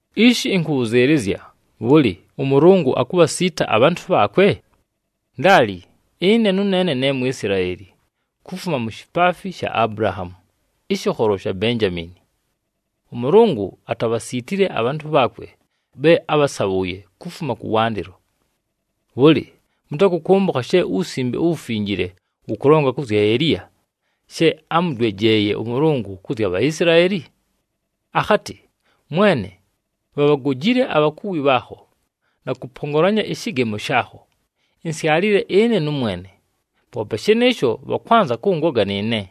Ishi ɨnkʉbhʉzɨɨlɨzya, bhʉlɨ, ʉMʉlʉngʉ akubhasiita abhantʉ bhaakwe? Ndaali! Ɨne nʉneene ne Mwisilaeli, kufuma mu shipaafi sha Abulahaamu, ɨshɨkholo sha Benjamiini. ɄMʉlʉngʉ atabhasiitile abhantʉ bhaakwe bhe ábhasabhʉʉye kufuma kʉwandɨlo. Bhʉlɨ, mʉtakʉkʉmbʉkha she uWusimbe uWufinjile wʉkʉlonga kʉ zya Eliya, she ámʉdwejeeye ʉMʉlʉngʉ kʉ zya Bhaisilaeli? Akhatɨ, “Mwene, bhabhagojile abhakuwi bhaakho, na kʉpongolanya ɨshɨgemo shaakho. Insyalile ɨne nʉmwene, poope shɨnɨɨsho bhakwanza kʉngoga nɨɨne!”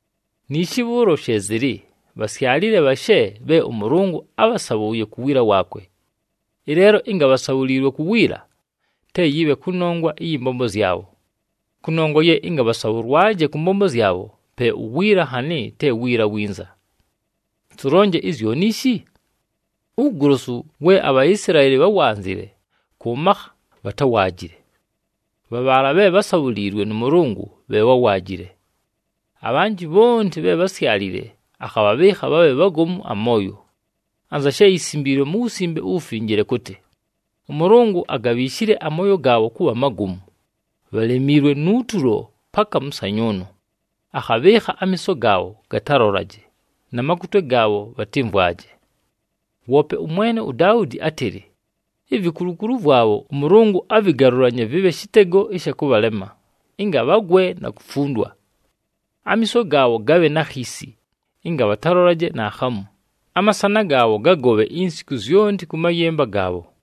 Niishi bhʉʉlo she zɨlɨ, bhasyalile bhashe bhe ʉMʉlʉngʉ ábhasabhʉʉye ku wiila waakwe. Ɨleelo ɨnga bhasabhuliilwe ku wiila, te yɨbhe kʉnongwa ɨyɨ mbombo zyabho. Kʉnongwa ye ɨnga bhasabhʉlwaje kʉ mbombo zyabho, pe uwiila nhanɨ te wiila winza. Tʉlonje izyoni ishi? Uwugolosu we aBhaisilaeli bháwanzile kʉ makha bhatáwaajile. Bha bhaala bhe bhásabhuliilwe nʉ Mʉlʉngʉ bhe bháwaajile. Abhanjɨ bhonti bhe bhásyalile akhabhabhɨɨkha bhabhe bhagomu amooyo, anza she yisimbiilwe mu Wusimbe uWufinjile kʉtɨ, “ɄMʉlʉngʉ agabhiishile amooyo gaabho kʉbha magomu, bhalemiilwe nu tulo, paka mʉsanyʉʉnʉ akhabhɨɨkha amiiso gaabho gatalolaje, na makutwe gaabho gatɨmvwaje.” Woope ʉmwene uDaudi átɨlɨ, “Ivikulukulu vwabho, ʉMʉlʉngʉ avɨgalʉlanye vɨbhe shɨtego ɨsha kʉbhalema ɨnga bhagwe na kufundwa. Amiiso gaabho gabhe na khiisi, ɨnga bhatalolaje naakhamu, amasana gaabho gagobhe insiku zyonti kʉ mayɨmba gaabho.”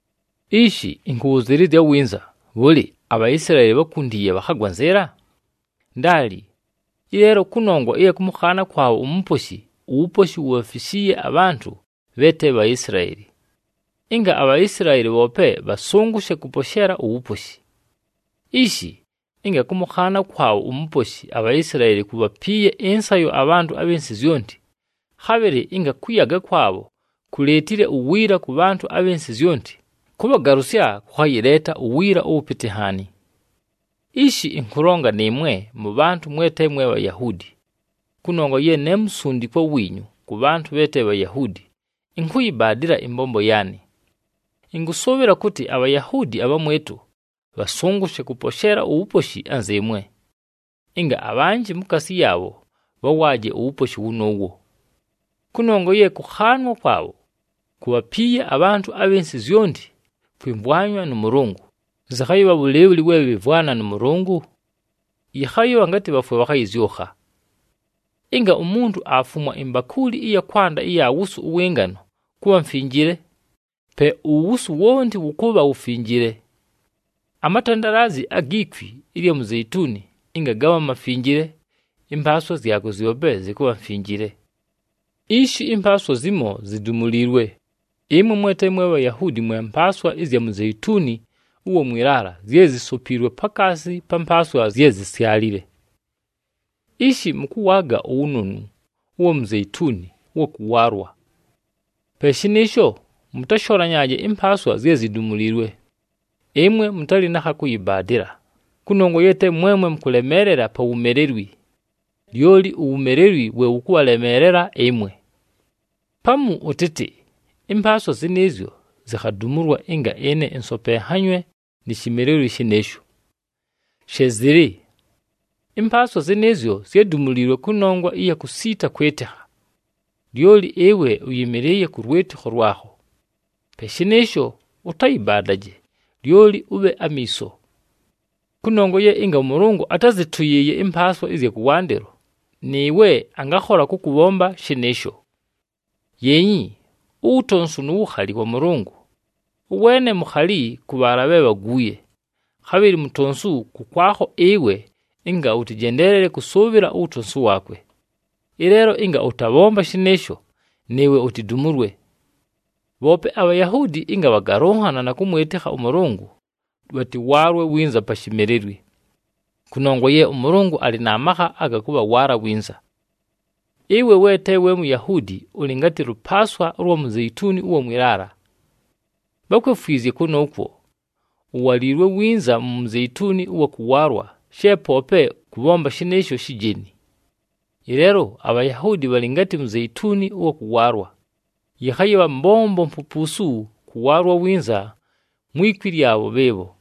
Ishi, ɨnkʉbhʉzɨɨlɨzya winza, bhʉlɨ, aBhaisilaeli bhákuntiiye, bhakhagwa nzɨɨla? Ndaali! Ɨleelo kʉnongwa ɨya kʉmʉkhaana kwabho uMuposhi, uwuposhi wubhafishiiye abhantʉ bhe te Bhaisilaeli, ɨnga aBhaisilaeli bhoope bhasʉngʉshe kʉposheela uwuposhi. Ishi, ɨnga kʉmʉkhaana kwabho uMuposhi aBhaisilaeli kubhapiiye ɨnsayo abhantʉ abhɨ nsɨ zyonti, khabhɨlɨ ɨnga kʉyaga kwabho kuleetile uwiila kʉ bhantʉ abhɨ nsɨ zyonti, kʉbhagalʉsya kʉkhayɨleeta uwiila ʉwʉpɨtɨ nhaani. Ishi, ɨnkʉlonga nɨɨmwe mʉbhantʉ mwe te mwe Bhayahuudi. Kʉnongwa ye ne musundikwa wiinyu kʉ bhantʉ bhe te Bhayahuudi, ɨnkʉyɨbaadɨla ɨmbombo yaanɨ. Ɨnkʉsʉʉbhɨla kʉtɨ aBhayahuudi abhamwɨtʉ bhasʉngʉshe kʉposheela uwuposhi anzɨɨmwe, ɨnga abhanjɨ mukaasi yaabho bhawaaje uwuposhi wʉnʉʉwo. Kʉnongwa ye kʉkhaanwa kwabho kubhapiiye abhantʉ abhɨ nsɨ zyonti kwɨmvwanywa nʉ Mʉlʉngʉ, zɨkhayɨbha bhʉlɨɨbhʉlɨ we bhɨmvwana nʉ Mʉlʉngʉ? Yɨkhayɨbha ngatɨ bhafwe, bhakhayɨzyʉkha! Ɨnga umuntu aafumwa imbakuuli ɨya kwanda ɨya wusu ʉwɨ ngano kʉbha mfinjile, pe uwusu wonti wʉkʉbha wufinjile. Amatandalaazi agi kwi ɨlya muzeituni ɨnga gabha mafinjile, ɨmpaaswa zyakwe zyope zɨkʉbha mfinjile. Ishi ɨmpaaswa zimo zidumuliilwe, ɨmwe mwe te mwe Bhayahuudi mwe mpaaswa ɨzya muzeituni ʉwa mwɨ laala zye zisopiilwe pakaasi pa mpaaswa zye zisyalile. Ishi mʉkʉwaaga uwunonu ʉwa muzeituni ʉwa kʉwaalwa. Pe shɨnɨɨsho, mʉtasholanyaaje ɨmpaaswa zye zidumuliilwe. Ɨmwe mʉtalɨ na kha kʉyɨbaadɨla, kʉnongwa ye te mwemwe mʉkʉlemeelela pa wumelelwi, lyoli uwumelelwi we wʉkʉbhalemeelela ɨmwe. Pamu ʉtɨtɨ, “Ɨmpaaswa zɨnɨɨzyo zikhadumulwa ɨnga ɨne ɨnsopenhanywe ni shimelelwi shɨnɨɨsho.” She zɨlɨ! Ɨmpaaswa zɨnɨɨzyo zyádumuliilwe kʉnongwa ɨya kusiita kwɨtɨkha. Lyoli ɨwe ʉyɨmɨlɨɨye kʉ lwɨtɨkho lwakho. Pe shɨnɨɨsho, ʉtayɨbaadaje, lyoli ʉbhe amiiso. Kʉnongwa ye ɨnga ʉMʉlʉngʉ atázɨtʉyɨɨye ɨmpaaswa ɨzya kʉwandɨlo, nɨɨwe angakhola kʉkʉbhomba shɨnɨɨsho. Yeenyi uwutonsu nu wukhali wa Mʉlʉngʉ, ʉweene mukhali kʉ bhaala bhe bhaguuye, khabhɨlɨ mutonsu kʉkwakho ɨwe ɨnga ʉtɨjendeleele kʉsʉʉbhɨla uwutonsu waakwe. Ɨleelo ɨnga ʉtabhomba shɨnɨɨsho, nɨɨwe utidumulwe. Bhoope aBhayahuudi ɨnga bhagalʉnhana na kʉmwɨtɨkha ʉMʉlʉngʉ, bhatɨwaalwe winza pa shimelelwi. Kʉnongwa ye ʉMʉlʉngʉ alɨ na makha aga kʉbhawaala winza. Ɨwe we te we Muyahuudi ʉlɨ ngatɨ lʉpaaswa ʉlwa muzeituni ʉwa mwɨ laala. Bhákwefwizye kʉnʉʉkwo, uwaliilwe winza mu muzeituni ʉwa kʉwaalwa she poope kʉbhomba shɨnɨɨsho shijeni. Ɨleelo aBhayahuudi bhalɨ ngatɨ muzeituni ʉwa kʉwaalwa, yɨkhayɨbha mbombo mpupuusu kʉwaalwa winza mwi kwi lyabho bhɨɨbho.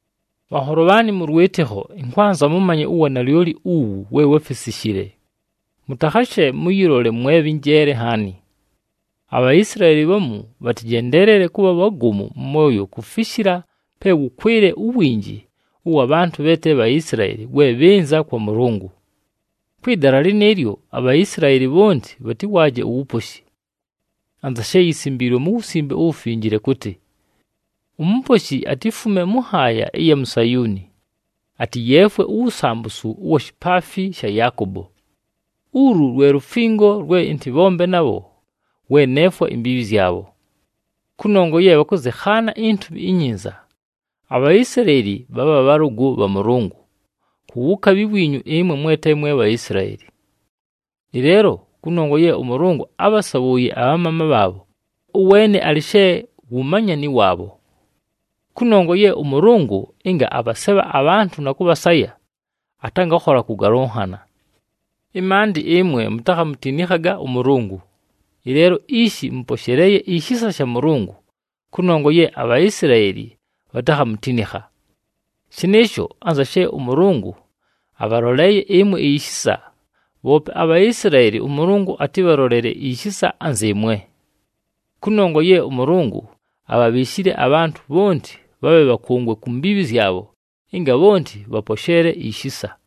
Bhanholo bhaanɨ mʉ lwɨtɨkho, ɨnkwanza mʉmanye uwanalyoli uwu we wáfisishile, mʉtakhashe mʉyɨlole mwe bhɨ njeele nhaani. ABhaisilaeli bhamu bhatɨjendeelele kʉbha bhagomu mʉ mooyo kufishila pe wʉkwɨle uwinji ʉwa bhantʉ bhe te Bhaisilaeli we bhɨnza kwa Mʉlʉngʉ. Kwɨ dala lɨnɨɨlyo, aBhaisilaeli bhonti bhatɨwaaje uwuposhi. Anza she yisimbiilwe mu Wusimbe uWufinjile kʉtɨ, “UMuposhi atifume mʉ nhaaya ɨya mu Sayuuni, atɨyeefwe uwusambusu ʉwa shipaafi sha Yaakobo. Ulu lwe lufingo lwe ɨntɨbhombe nabho, we neefwa imbiibhi zyabho.” Kʉnongwa ye bhakʉzɨkhaana iNtumi iNyinza, aBhaisilaeli bhabha bhalʉgʉ bha Mʉlʉngʉ, ku wukabhi wiinyu ɨmwe mwe te mwe Bhaisilaeli. Ɨleelo kʉnongwa ye ʉMʉlʉngʉ ábhasabhʉʉye abhamaama bhaabho, ʉweene alɨ she wu manyani waabho. Kʉnongwa ye ʉMʉlʉngʉ ɨnga abhasebha abhantʉ na kʉbhasaya, atangakhola kʉgalʉnhana. Ɨmaandɨ ɨmwe mutakhamutinikhaga ʉMʉlʉngʉ, ɨleelo ishi mʉposheleeye ishisa sha Mʉlʉngʉ kʉnongwa ye aBhaisilaeli bhatakhamutinikha. Shɨnɨɨsho, anza she ʉMʉlʉngʉ abhaloleeye ɨmwe ishisa, bhoope aBhaisilaeli ʉMʉlʉngʉ atɨbhalolele ishisa anzɨɨmwe. Kʉnongwa ye ʉMʉlʉngʉ abhabhiishile abhantʉ bhonti bhabhe bhakʉngwe ku mbiibhi zyabho ɨnga bhonti bhaposheele ishisa.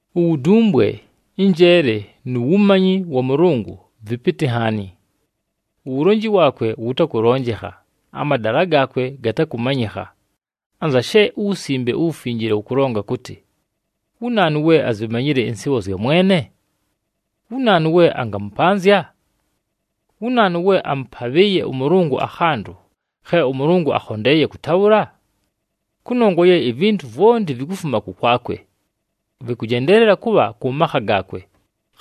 Uwudumbwe, ɨnjeele nu wumanyi wa Mʉlʉngʉ vɨpɨtɨ nhaani! Uwulonji waakwe wʉtakʉlonjekha, amadala gaakwe gatakʉmanyɨkha! Anza she uWusimbe uWufinjile wʉkʉlonga kʉtɨ, “Wu naanu we azimanyile ɨnsɨɨbho zya Mwene? Wu naanu we angamʉpanzya?” “Wu naanu we amʉpabhɨɨye ʉMʉlʉngʉ akhantʉ, khe ʉMʉlʉngʉ akhondeeye kʉtabhʉla?” Kʉnongwa ye ivintu vwonti vikufuma kʉkwakwe. Vɨkʉjendeelela kʉbha kʉ makha gaakwe,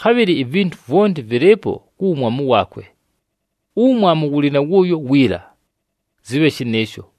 khabhɨlɨ ivintu vwonti vɨlɨɨpo ku wumwamu waakwe. Uwumwamu wʉlɨ na wʉʉyo wiila! Zɨbhe shɨnɨɨsho.